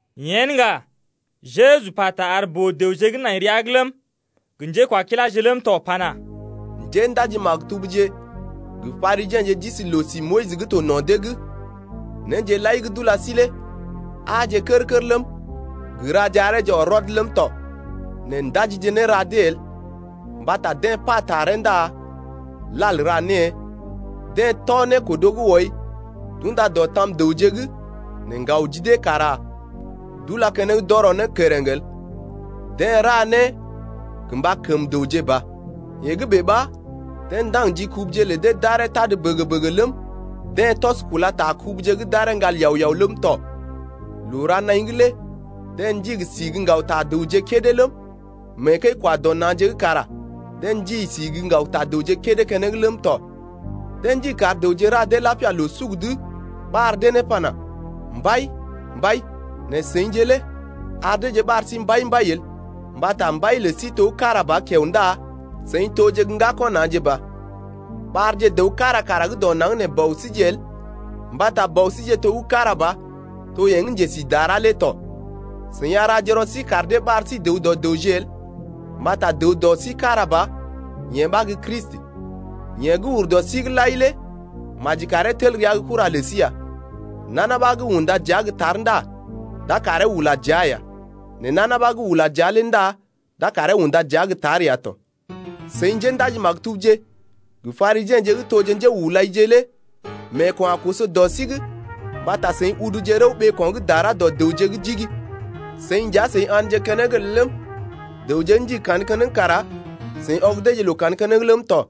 Yen ŋga, Jeju pata ar boo-dəwje gə́ nai rəa’g ləm, gə njékwakiláje ləm tɔ pana: Njéndaji-maktubje gə Parisiḛje d’isi loo-si Moyis gə́ to no̰ dee’g. Néje lai gə́ d’ula sí lé aaje kər-kər ləm, gə raje areeje ɔr rɔd ləm tɔ nɛ ndajije néra dee el. Mbata deḛ pa taree ndá lal ra née. Deḛ tɔ nékodo gə́ wɔi d’unda dɔ tam dəwje’g nɛ ŋgaw ji dee kara d’ula keneŋ d’ɔrɔ ne kereŋ el. Deḛ ra né gə mba kəm dəwje ba. Yee gə́ bèe ɓa deḛ ndaŋg ji kubuje lə dee d’aree tad bəgə-bəgə ləm, deḛ tɔs kula ta kubuje’g d’aree ŋgal yao-yao ləm tɔ. Loo-ra-naḭ’g lé deḛ ndigi si gə́ ŋgaw ta dəwje kédé ləm, mee kəi-kwa-dɔ-na̰je’g kara deḛ ndigi si gə́ ŋgaw ta dəwje keneŋ kédé ləm tɔ. Deḛ ndigi kar dəwje ra dee lapia loo-suk’d ɓar dee ne pana: Mbai, mbai. Nɛ seḭje lé ar deeje ɓar sí Mbai, mbai el. Mbata Mbai lə sí to gə́ kára ba kiao ndá seḭ toje gə́ ŋgako̰ na̰je ba. Ɓarje dəw kára kara gə́ dɔ naŋg nee bɔ síje el mbata Bɔ síje to gə́ kára ba, to yeḛ gə́ njesi dara lé tɔ. Seḭ a raje rɔ sí kar dee ɓar sí dəw dɔ dəwje el. Mbata dəw dɔ sí kára ba yeḛ ɓa gə́ Kristi. Yeḛ gə́ ur dɔ sí’g lai lé maji karee tel rəa gə́ kura lə sí ya. Nana ɓa gə́ unda dəa gə́ tar ndá d’a karee ula dəa ya. Nɛ nana ɓa gə́ ula dəa lé ndá d’a karee unda dəa gə́ tar ya tɔ. Seḭ njéndaji-maktubje gə Parisiḛje gə́ toje njéhulaije lé meeko̰ a koso dɔ sí’g mbata seḭ uduje rəw ɓeeko̰ gə́ dara dɔ dəwje’g jigi. Seḭje nja seḭ a̰dje keneŋ el ləm, dəwje gə́ ndigi kandə keneŋ kara seḭ ɔg deeje loo kandə keneŋ ləm tɔ.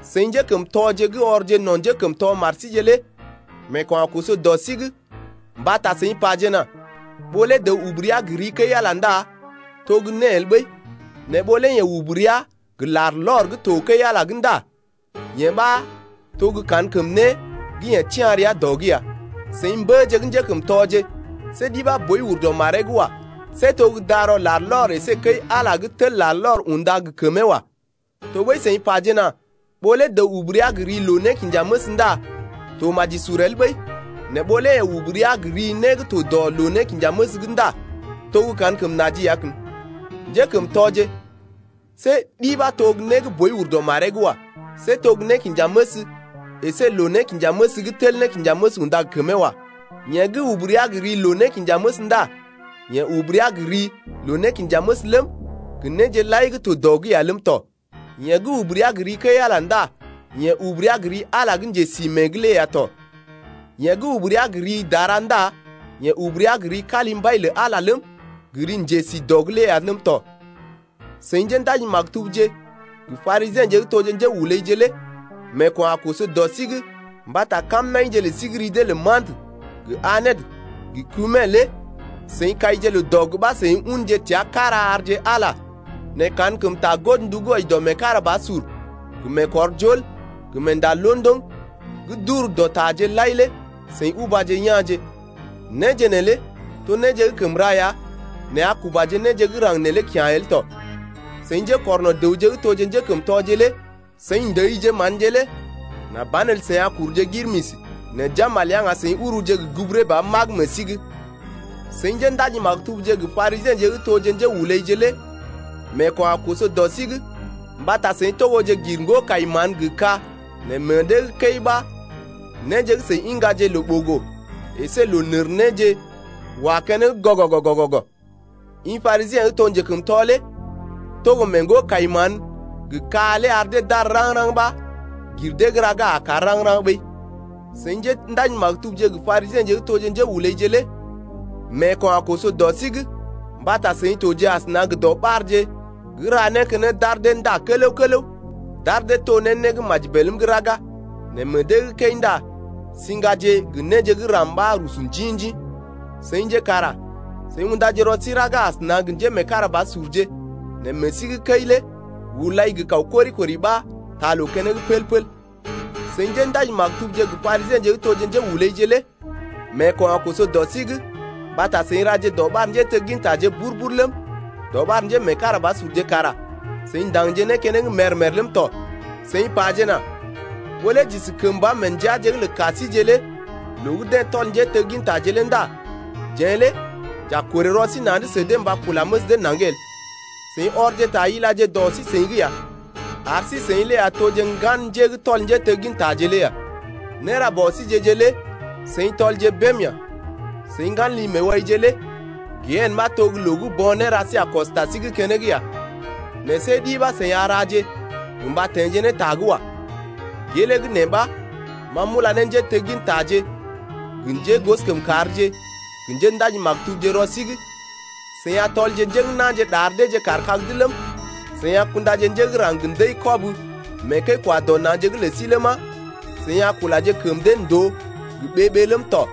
Seḭ njékəmtɔje gə́ ɔrje no̰ njékəmtɔ mar síje lé meeko̰ a koso dɔ sí’g mbata seḭ pajena ɓó lé dəw ubu rəa gə ri kəi-Ala ndá to gə́ né el ɓəi, nɛ ɓó lé yeḛ ubu rəa gə larlɔr gə́ to kəi-Ala’g ndá yee ɓa to gə́ kankəm né gə́ yeḛ tia̰ rəa dɔ’g ya. Seḭ mbəje gə́ njékəmtɔje, see ɗi ɓa boi ur dɔ maree’g wa. See to gə́ darɔ larlɔr əsé kəi-Ala gə́ tel larlɔr unda gə kəmee wa. Tɔɓəi seḭ pajena ɓó lé dəw ubu rəa gə ri loo-nékinjaməs ndá to maji sur el ɓəi, nɛ ɓó lé yeḛ ubu rəa gə ri né gə́ to dɔ loo-nékinjaməs’g ndá to gə́ kankəm naji ya kən. Njékəmtɔje, see ɗi ɓa to né gə́ boi ur dɔ maree’g wa. See to gə́ nékinjaməs əsé loo-nékinjaməs gə́ tel nékinjaməs unda gə kəmee wa. Yeḛ gə́ ubu rəa gə ri loo-nékinjaməs ndá yeḛ ubu rəa gə ri loo-nékinjaməs ləm, gə néje lai to dɔ’g lé ya ləm tɔ. Yeḛ gə́ ubu rəa gə ri kəi-Ala ndá yeḛ ubu rəa gə ri Ala lé gə́ njesi mée’g lé ya tɔ. Yeḛ gə́ ubu rəa gə ri dara ndá yeḛ ubu rəa gə ri kalimbai lə Ala lé ləm, gə ri njesi dɔ’g lé ya ləm tɔ. Seḭ njéndaji-maktubje gə Parisiḛje gə́ toje njéhulaije lé meeko̰ a koso dɔ sí’g mbata kamnaḭje lə sí gə́ ri dee lə mantə gə anet gə kumin lé seḭ kaije loo-dɔg ɓa seḭ unje təa kára arje Ala lé nɛ kankəm ta godndu gə́ wɔji dɔ meekarabasur gə meekɔrjol gə meenda londoŋ gə́ d’ur dɔ taje lai lé seḭ ubaje ya̰je. Néje neelé to néje gə́ kəm ra ya nɛ a kubaje néje gə́ raŋg neelé kya̰je el tɔ. Seḭ njékɔrno̰ dəwje gə́ toje njékəmtɔje lé seḭ ndəije manje lé nà banelə seḭ a kuruje girmisi, nɛ jambal ya ŋga seḭ uruje gə́ guburee ba magə meḛ sí’g. Seḭ njéndaji-maktubje gə Parisiḛje gə́ toje njéhulaije lé meeko̰ a koso dɔ sí’g mbata seḭ togoje gir ŋgo-kai-mán gə ka nɛ meḛ dee gə́ kəi ɓa néje gə́ seḭ iŋgaje loo-ɓogo əsé loo-nərnéje wa keneŋ gɔgɔgɔ-gɔgɔgɔ. I Parisiḛ gə́ to njekəmtɔ lé togo mee ŋgo-kai-mán gə ka lé ar dee d’àr raŋg-raŋg ɓa gir dee gə́ raga a kàr raŋg-raŋg ɓəi. Seḭ njéndaji-maktubje gə Parisiḛje gə́ toje njéhulaije lé meeko̰ a koso dɔ sí’g mbata seḭ toje asəna gə dɔɓarje gə́ ra né keneŋ d’ar dee nda kələw-kələw d’ar dee to ne né gə́ maji bèlm’g raga, nɛ meḛ dee gə́ kəi ndá siŋgaje gə néje gə́ ram ɓa rusu njḭ-njḭ. Seḭje kara seḭ undaje rɔ sí raga asəna gə njémeekarabasurje nɛ meḛ sí gə́ kəi lé hulai gə kaw kori-kori ɓa taa loo keneŋ pəl-pəl. Seḭ njéndaji-maktubje gə Parisiḛje gə́ toje njéhulaije lé meeko̰ a koso dɔ sí’g mbata seḭ raje dɔɓar njéteggintaje bur-bur ləm, dɔɓar njémeekarabasurje kara seḭ ndaŋgje né keneŋ mèr-mèr ləm tɔ. Seḭ pajena: Ɓó lé j’isi kəmba mee ndəaje’g lə ka síjeḛ lé loo gə́ deḛ tɔl njéteggintaje lé ndá jeḛ lé j’a korè rɔ sí na̰’d sə dee mba kula məs dee naŋg el. Seḭ ɔrje ta ilaje dɔ sí-seḭ’g ya, ar sí-seḭ lé ya toje ŋgan njé gə́ tɔl njéteggintaje lé ya. Néra bɔ síje-je lé seḭ tɔlje bém ya! Seḭ ŋgan li-meewaije lé gehene ɓa to gə́ loo gə́ bo̰ néra sí a kɔs ta sí’g keneŋ ya nɛ see ɗi ɓa seḭ a raje gə mba teḛje ne ta’g wa. Gelee gə́ nee ɓa ma m’ula ne njéteggintaje gə njégosokəmkàrje gə njéndaji-maktubje rɔ sí’g. Seḭ a tɔlje njé gə́ na̰je ɗar deeje kaar kag’d ləm, seḭ a kundaje njé gə́ raŋg gə ndəi-kɔb mee kəi-kwa-dɔ-na̰je’g lə sí ləma, seḭ a kulaje kəm dee ndòo gə ɓee-ɓee ləm tɔ,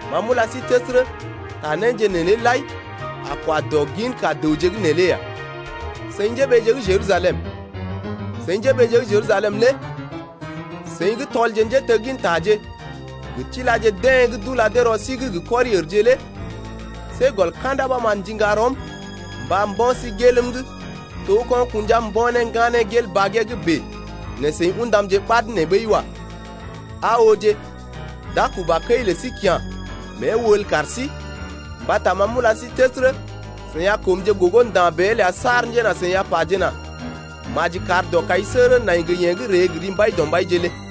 Ma m’ula sí təsərə, ta néje neelé lai a kwa dɔ ginka dəwje gə́ nee lé ya. Seḭ njéɓeeje gə́ Jerusalem, seḭ njéɓeeje gə́ Jerusalem lé seḭ gə́ tɔlje njéteggintaje gə tilaje deḛ gə́ d’ula dee rɔ sí’g gə kɔri-ərje lé see gɔl ka̰da ɓa ma m’ndiŋga rɔm mba mbo̰ sí gelm’g to gə́ ko̰ kṵja mbo̰ ne ŋganee gel bagee’g bèe nɛ seḭ ṵdamje ɓad nee ɓəi wa. Aa ooje, d’a kuba kəi lə sí kya̰ mée wəl kar sí. Mbata ma m’ula sí təsərə, seḭ a koomje gogo nda̰ bèe el saar njena seḭ a pajena: Maji kar dɔkaisəgərə nai gə yeḛ gə́ ree gə ri Mbaidɔmbaije lé ya.